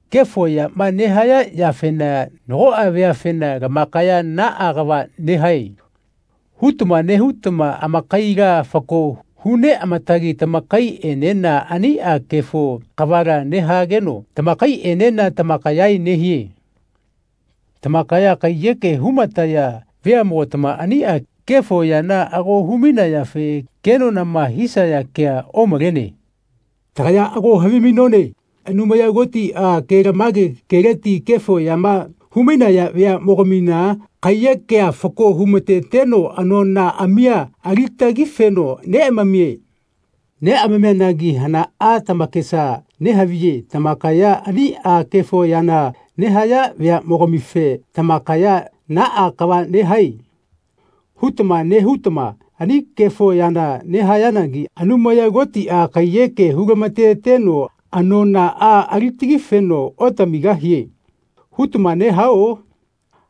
Kefo yama nehaya yafena nagoꞌa veafena “Lamakaya naꞌa kava nehae.” hutama nehutama amakaila fako hu neꞌamatagi tamakaiꞌenena aniꞌa kefo kavala nehageno tamakaiꞌenena tamakaya nehie. Tamakaya kaiyeke humataya veamogatama aniꞌa kefo yana ago humainayafe kenonama hisaya kea omalene. Tagaya ago havimainone Anumaya Kotiꞌa kelamage keleti kefo yama humainaya veaꞌmogamina kaiyekea fako humateteno anonaꞌamia alitagifeno neꞌamamie. Neꞌamamianagi hanaꞌa tamakesa nehaviye tamakaya aniꞌa kefo yana nehaya veaꞌmogamife “Tamakaya naꞌa kava nehae.” hutama nehutama ani kefo yana nehayanagi “Anumaya Kotiꞌa kaiyeke hulamateteno anonaꞌa alitagifeno otamigahie.” hutama nehao?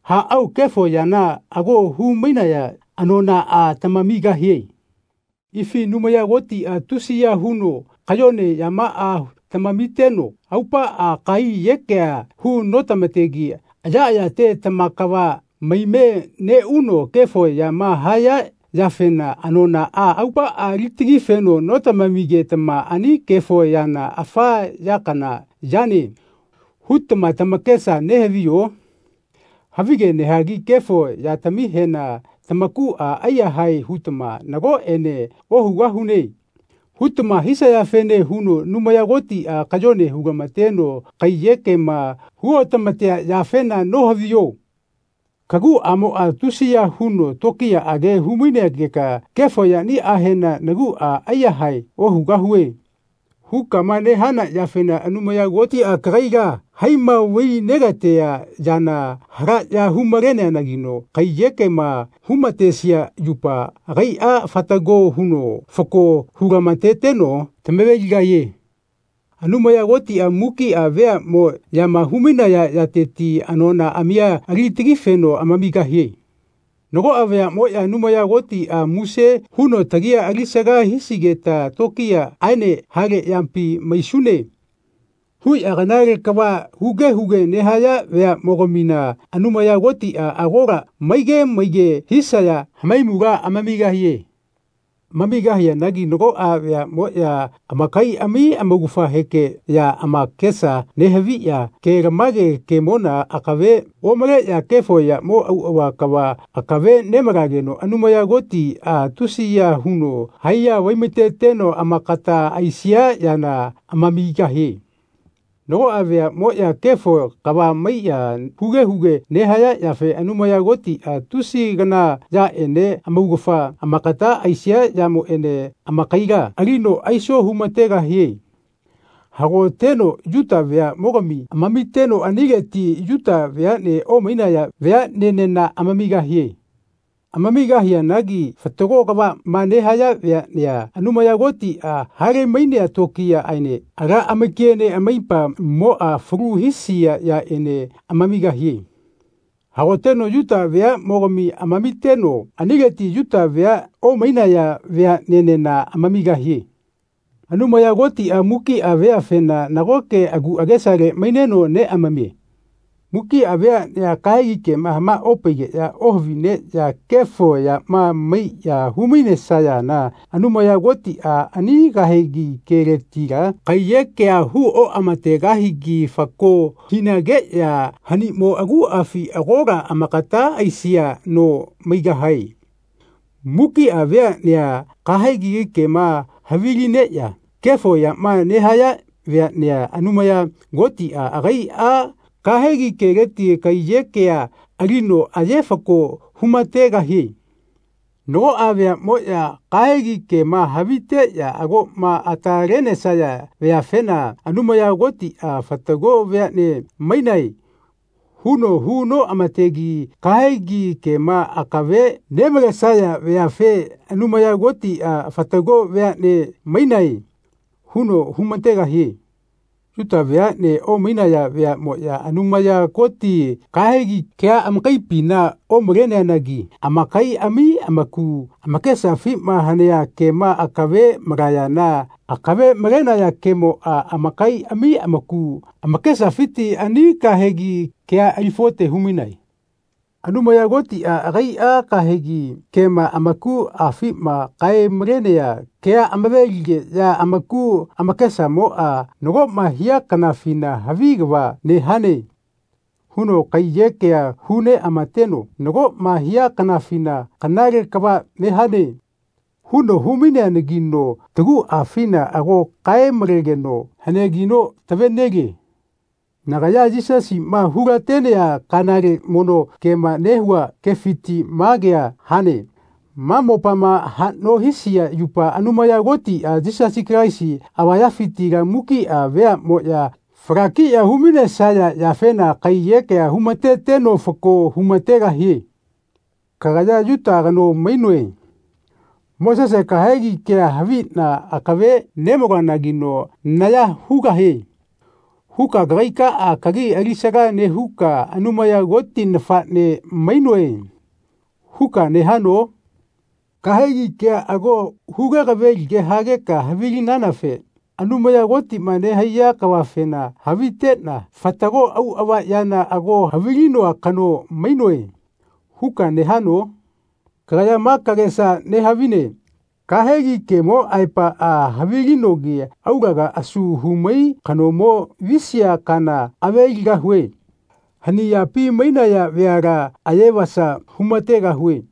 Aꞌao kefo yana ago humainaya anonaꞌa tamamigahie. Ifi Anumaya Kotiꞌa tusiya huno kayone yamaꞌa tamamiteno aupaꞌa kaiyekea hu notamategi ayaꞌayate tamakava maime neꞌuno kefo yama haya yafena anonaꞌa aupaꞌa alitagifeno notamamigetama “Ani kefo yana afa ya kana yane.” hutama tamakesa nehaviyo? Havige nehagi kefo yatamihena tamakuꞌa aiyahae hutama “Nagoꞌene ohugahune.” hutama hisayafene huno Anumaya Kotiꞌa kayone hulamateno kaiyekema huotamatea yafena nohaviyo? Kaguꞌamoꞌa tusiya huno tokiyaꞌage humainegeka “Kefo yaniꞌahena naguꞌa aiyahae ohugahue.” hukama nehana yafena Anumaya Kotiꞌa kagaila haima vai negatea yana halaꞌya humaleneanagino kaiyekema humatesia yupa agaiꞌa fatago huno fako hulamateteno tamaveligahie. Anumaya Kotiꞌa mukiꞌa veaꞌmoꞌyama humainaya yateti anonaꞌamia alitagifeno amamigahie. Nagoꞌa veaꞌmoꞌya “Anumaya Kotiꞌa muse huno tagia alisaga hisigeta tokiyaꞌaene hale yapi maisune.” huꞌya kanale kava huge huge nehaya veaꞌmogamina Anumaya Kotiꞌa agola maige maige hisaya hamaimula amamigahie. Amamigahianagi nagoꞌa veaꞌmoꞌya amakaiꞌami amaugafahekeꞌya amakesa nehaviꞌya kelamage kemona akave omaleꞌya kefo yamo auꞌava kava akave nemalageno Anumaya Kotiꞌa tusiya huno haiya vaimateteno amakata aisia yana amamigahie. Nagoꞌa veaꞌmoꞌya kefo kava maiꞌya huge huge nehaya yafe Anumaya Kotiꞌa tusi kana yaꞌene amaugafa amagata aisia yamoꞌene amakaila alino aiso humategahie. Hagoteno Yuta veaꞌmogami amamiteno anileti Yuta veaꞌne omainaya veaꞌnenena amamigahie. Amamigahianagi fatago kavaꞌma nehaya veaꞌnea Anumaya Kotiꞌa halemainea tokiyaꞌaene ala amakiene amaipamoꞌa falu hisia yaꞌene amamigahie. Hagoteno Yuta veaꞌmogami amamiteno anileti Yuta vea omainaya veaꞌnenena amamigahie. Anumaya Kotiꞌa mukiꞌa veafena nagoke agu agesale maineno neꞌamamie. Mukiꞌa veaꞌnea kahegi kema hamaopaigeꞌya ohavineꞌya kefo yama maiꞌya humainesayana Anumaya Kotiꞌa ani kahegi keletila kaiyekea hu oꞌamategahigi fako hinageꞌya hanimo aguꞌafi agola amakata aisia no maigahae. Mukiꞌa veaꞌnea kahegi kema havilineꞌya kefo yama nehaya veaꞌnea Anumaya Kotiꞌa agaiꞌa kahegi keleti kaiyekea alino aye fako humategahie. Nagoꞌa veaꞌmoꞌya kahegi kema haviteꞌya agoꞌma atalenesaya veafena Anumaya Kotiꞌa “Fatago veaꞌne mainae.” huno hu noꞌamategi kahegi kema akave nemalesaya veafe Anumaya Kotiꞌa “Fatago veaꞌne mainae.” huno humategahie. Yuta veaꞌne omainaya veaꞌmoꞌya Anumaya Koti kahegi kea amakaipina omaleneanagi amakaiꞌami amaku amakesafima hanea kema akave malayana akave malenaya kemoꞌa amakaiꞌami amaku amakesafiti ani kahegi kea ali falote humainae. Anumaya Kotiꞌa agaiꞌa kahegi kema amakuꞌafima kae-malenea kea amave-ligeꞌya amaku amakesamoꞌa nagoꞌma hia kanafina “Havi kava nehane.” huno kaiyekea hu neꞌamateno nagoꞌma hia kanafina “Kanale kava nehane.” huno humaineanagino taguꞌafina ago kae-malegeno haneagino tavenelie. Nagaya Yisasiꞌma hulatenea kanale mono kema nehua kefiti ma kea hane, ma mopama haꞌno hisia yupa Anumaya Kotiꞌa Yisasi Kalaisi avayafitila mukiꞌa veaꞌmoꞌya falakiꞌya humainesaya yafena kaiyekea humateteno fako humategahie. Kagaya “Yuta kano mainoe. Mosese kahegi kea haviꞌna akave nemaloanagino naya hugahie.” huka kagaikaꞌa kagi alisaga nehuka “Anumaya Koti nafaꞌne mainoe.” huka nehano? Kahegi kea ago huge kavelige hageka havilinanafe “Anumaya Kotima nehaiya kavafena haviteꞌna fatago auꞌava yana ago havilinoa kano mainoe.” huka nehano? Kagaya ma kagesa nehavine “Kahegi kemo aepaꞌa havilinogi aulaga asu humai kanomo visia kana aveligahue. Hani yapi mainaya veala ayevasa humategahue.”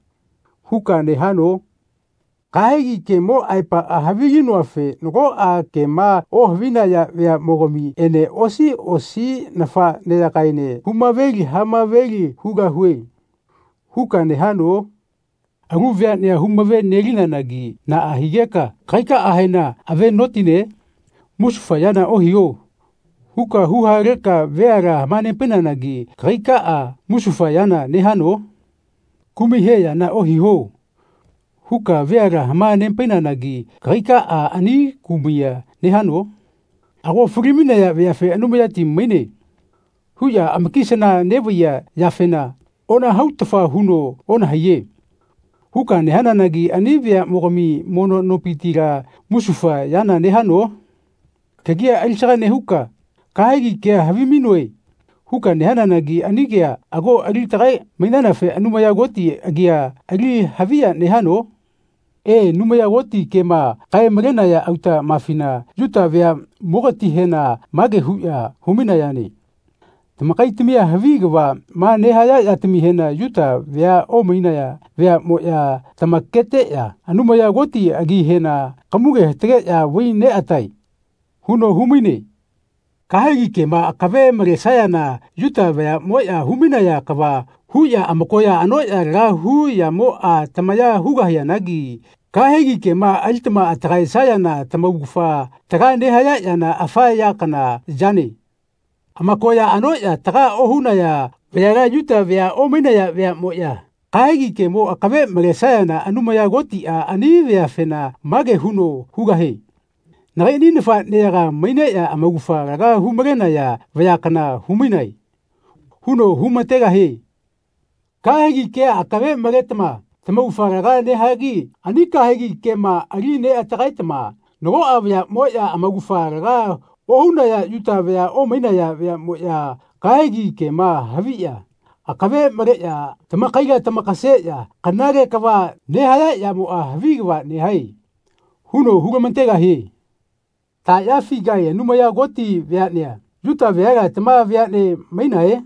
huka nehano? “Kahegi kemo aepaꞌa havilinoafe nagoꞌa kema ohavinaya veaꞌmogamiꞌene osi osi nafaꞌneyagaene humaveli hamaveli hugahue.” huka nehano? Alu veaꞌnea humave-nelinanagi naꞌa higeka kagaikaꞌahena ave notine? “Musufa yana ohiho.” huka huhaleka veala hamanepainanagi kagaikaꞌa musufa yana nehano? “Kumai he yana ohiho.” huka veala hamanepainanagi kagaikaꞌa ani kumaiya nehano? Ago falimainaya veafe “Anumayati maine.” huꞌya amakisana neꞌvaiya yafena “Onahautafa huno onahaiye.” huka nehananagi ani veaꞌmogami mono nopitila musufa yana nehano? Kagia alisaga nehuka “Kahegi kea havimainoe.” huka nehananagi ani kea ago alitagae-mainanafe Anumaya Koti agia ali haviya nehano? E, Anumaya Koti kema kae-malenaya autaꞌmafina Yuta veaꞌmogatihena mage huꞌya humainayane “Tamakaitamia havi kavaꞌma nehaya yatamihena Yuta vea omainaya veaꞌmoꞌya tamaketeꞌya Anumaya Koti agihena kamuge hatageꞌya vai neꞌatae.” huno humaine. Kahegi kema akave malesayana Yuta vayaꞌmoꞌya humainaya kava huꞌya amakoya anoꞌya laga hu yamoꞌa tamaya hugahianagi kahegi kema alitama atagaesayana tamaugafa taga nehaya yana afa ya kana yane. Amakoya anoꞌya taga ohunaya vayala Yuta vea omainaya veaꞌmoꞌya kahegi kemo akave malesayana Anumaya Kotiꞌa ani veafena mage huno hugahie “Nagaiꞌni nafaꞌneyaga maineꞌya amaugafa laga humalenaya vaya kana humainae.” huno humategahie. Kahegi kea akave maletama tamaugafa laga nehagi ani kahegi kema ali neꞌatagaetama nagoꞌa vayaꞌmoꞌya, amaugafa laga ohunaya Yuta vea omainaya veaꞌmoꞌya, kahegi kema haviꞌya akave maleꞌya tamakaila tamakaseꞌya kanale kava nehaya yamoꞌa “Havi kava nehae.” huno hulamategahie. Taꞌyafigae Anumaya Koti veaꞌnea, Yuta veala, tama veaꞌne mainae?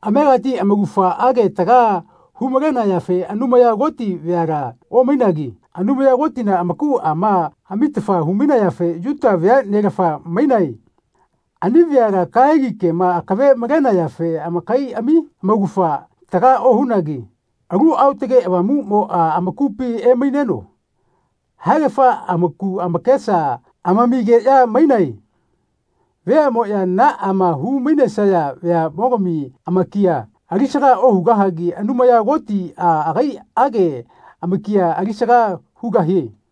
Amegati amaugafaꞌage taga humalenayafe Anumaya Koti veala omainagi Anumaya Kotina amakuꞌama amitafa humainayafe Yuta veaꞌnelafa mainae. Ani veala kahegi kema akave malenayafe amakaiꞌami amaugafa taga ohunagi Alu Aotage Avamuꞌmoꞌa amakupi emaineno haegafa amaku amakesa amamigeꞌya mainae. Veaꞌmoꞌya naꞌama humainesaya veaꞌmogami amakia alisaga ohugahagi Anumaya Kotiꞌa agaiꞌage amakia alisaga hugahie.